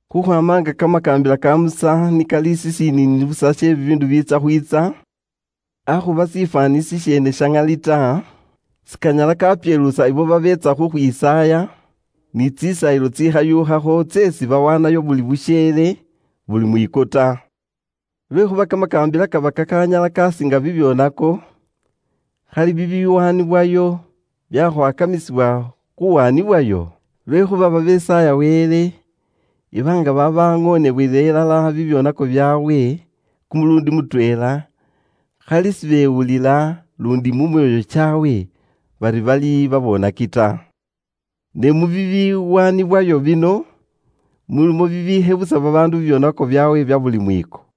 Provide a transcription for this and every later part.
Khukhwaama nga kamakaambila ka Musa ni kali shishiniini busa she bibiindu bibiitsya khwiitsa, akhuba shifwaani shisheene sha ŋali ta, sikanyala kapyeluusa ibo babeetsa khukhwisaaya ni tsisaayilo tsikhashuukhakho tseesi bawaanayo buli busheele, buli mwiiko ta. Lwekhuuba kamakaambila kaba kakanyala kasiinga bibyoonako khali bibiwaanibwayo byakhwakamisibwa khuwaanibwayo? Lwekhuuba babesaaya Wele iba nga babaŋoonebwela ilala bibyoonako byaabwe kumuluundi mutweela, khali sibewulila luundi mu myoyo kyaabwe bari bali babonaki ta. Ne mu bibiwaanibwayo bino, mulimo bibikhebusa babaandu bibyoonako byaabwe bya buli mwiiko.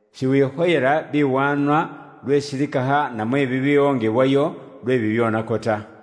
Shiwikhoyela biwaanwa lwe silikakha namwe bibiwongebwayo lwe bibyoonako ta.”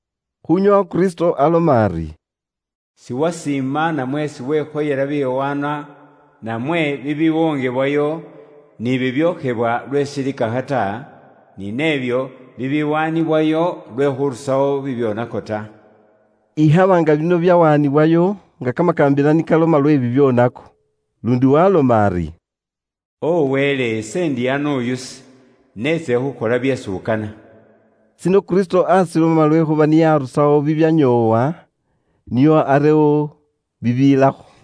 Khunyoowa Kristo aloma ari, “Siwasiima namwe siwekhoyela biwaanwa namwe bibiwongebwayo, ni bibyokhebwa lwe silikakha ta, ni nebyo bibiwaanibwayo lwe khuurusawo bibyoonako ta,” ikhaba nga bino byawaanibwayo nga kamakaambila ni kaloma lwe bibyoonako. Luundi ndi waaloma ari, “O Wele, ise ndi ano uyusi, neetsile khuukhola byeesi ukana.” Shino Kristo aashiloma lwekhuuba niye aarusawo tsisaayilo tsitsanyoowa, nio arewo isaayilo iyeewe umweene.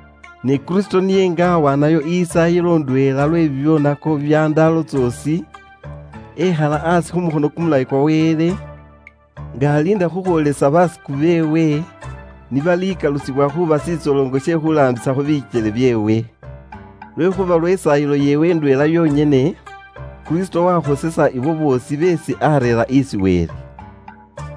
Ne Kristo niye aawaanayo isaayilo indweela yonyene lwe bibyoonako bya ndaalo tsoosi, lwanyuma wekhala aasi khu mukhono kumulayi kwa Wele, nga aliinda khukhwoolesa basiku beewe ni balikalusibwa khuuba shitsoloŋo she khuulaambisakho bikyele byeewe. Lwekhuuba lwe isaayilo yeewe indweela yonyene, Kristo waayikesa abo boosi beesi areera isi Wele, khuuba bakhosefu.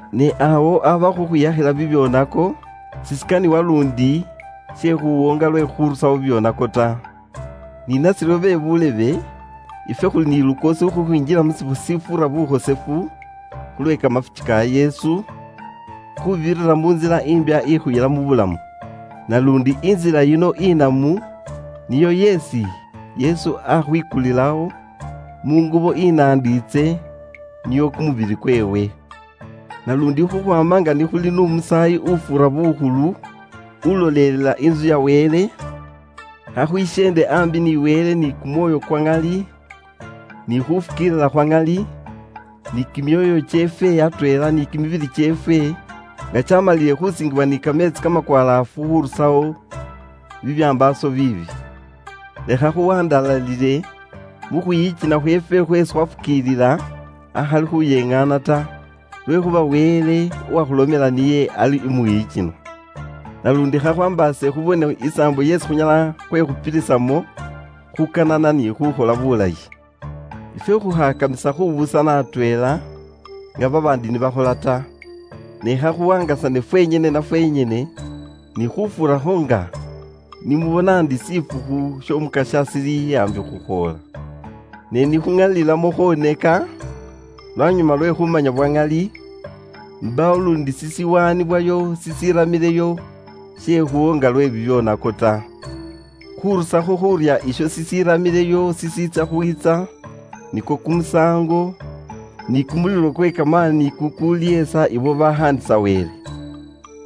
Ne awo aba khukhwiyakhila bibyoonako, sishikaniwa luundi she khuwoonga lwe khurusawo bibyoonako ta. Ni nashiryo be buulebe, ifwe khuli ni lukoosi khukhwinjila mu shifwo shifuura bukhosefu, khulwe kamafuki ka Yesu, khuubirira mu ntsila imbya ikhuyila mu bulamu. Naluundi intsila yino inamu niyo yeesi Yesu akhwikulilawo mu ngubo inandiitse, niyo kumubili kweewe. Naluundi khukhwaama nga ni khuli n'umusaayi ufuura bukhulu ulolelela intsu ya Wele, khakhwisyeende aambi ni Wele ni kumwoyo kwa ŋali ni khufukiilila khwa ŋali, ni kimyoyo kyeefwe atweela ni kimibili kyeefwe nga kyamalilile khusiingiwa ni kameetsi kamakwalaafu khurusawo bibyambaaso biibi. Lekha khuwandalalile mu khwiyikina khweefwe khweesi khwafukiilila akhali khuyengaana ta, lwekhuuba Wele uwakhulomela niye ali umwiyikinwa. Naluundi khakhwaambaase khubone isaambo yeesi khunyala khwekhupilisamo khukanana ni khukhola bulayi. Ifwe khukhakamisa khubuusana atweela nga babaandi ni bakhola ta, ne khakhuwaangasane fwenyene na fwenyene, ni khufuurakho nga ni mubona ndi shifukhu sh'Omukasya shili aambi khukhwoola. Ne ni khuŋalilamo khwoneka lwanyuma lwe khumanya bwa ŋali, mbaawo luundi shishiwaanibwayo shishiramileyo she khuwoonga lwe bibyoonako ta. Khurusakho khuurya isho shishiramileyo shishiitsya khwiitsa nikwo kumusaango, ni kumulilo kwe kamaani kukulihesa ibo babaakhaandisa Wele.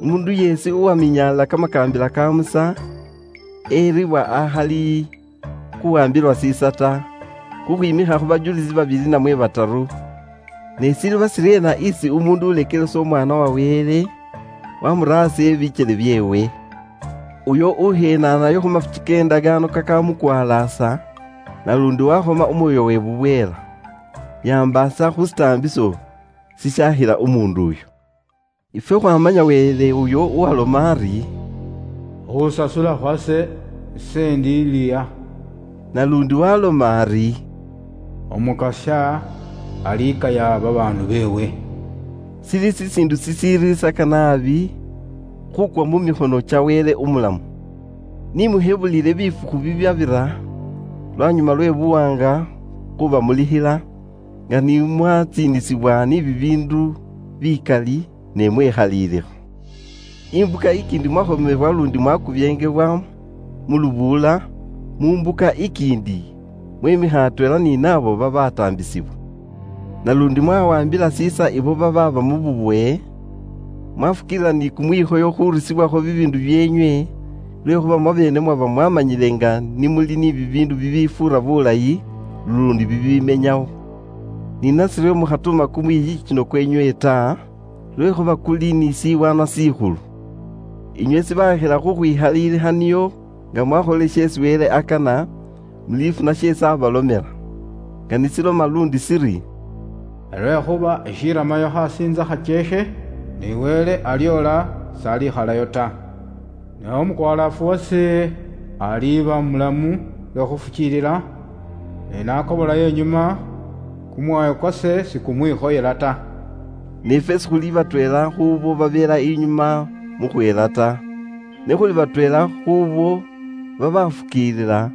Umuundu yeesi uwaminyalila kamakaambila ka Musa eribwa akhali khuwaambilwa shiisa ta, khukhwiimikha khu bajulisi babili namwe bataru. Ne shiliiba shiryeena isi muundu ulekelesa Umwaana wa Wele, wamura aasi ebikyele byeewe? Uyo ukhenaanayo khu mafuki ke ndakaano kakaamureerera bukhosefu, naluundi wakhoma Umwoyo we bubweela? Yambaasa khu shitaambiso shishaakhila umuundu uyo. Ifwe khwaamanya Wele uyo uwaaloma ari, “Khuusasula khukhwase, ise indiliha.” Naluundi waaloma ari, “Umukasya alikaya babaandu beewe.” Shili shishiindu shishiriisaka naabi khuukwa mu mikhono kya Wele umulamu. Ni mushebulile bifukhu bibyabira lwanyuma lwe buwaanga khubamulikhila nga ni mwatsiinisibwa ni bibiindu bikali, ne mwekhalilikha. Imbuka ikiindi mwakhomewa luundi mwakubyeengebwa mu lubuula, mu mbuka ikiindi mwemikha atweela ni naabo babataambisibwa. Naluundi mwawaambila shiisa ibo babaaba mu bubowe, mwafukiilila ni kumwikhoyo khurusibwakho bibiindu byeenywe lwekhuuba mwabeene mwaba mwaamanyile nga ni muli ni bibiindu bibifuura bulayi luundi bibimenyawo. Ni nashiryo mukhatuuma kumwiyikino kweenywe ta, lwekhuuba kuli ni shiwaanwa shikhulu. Inywe shibakhila khukhwikhalilikha nio nga mwakholile sheesi Wele akana, mulifuna sheesi abalomela. Nga ni shiloma luundi shili, “Lwekhuuba ishiramayo imbuka injeekhe iri, uyo uuli khukhwiitsa abe woolile, singane ekhalayo ta. Ne umukwalaafu wase aliiba mulamu lwe khufukiilila, ne nakobolayo inyuma, kumwoyo kwase sikumwikhoyela ta.” Ne ifwe sikhuli batweela khuubo babelayo inyuma mu khuhela ta. Ne khuli batweela khuubo babafukiilila,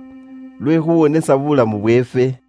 lwe khuwonesa buulamu bweefwe.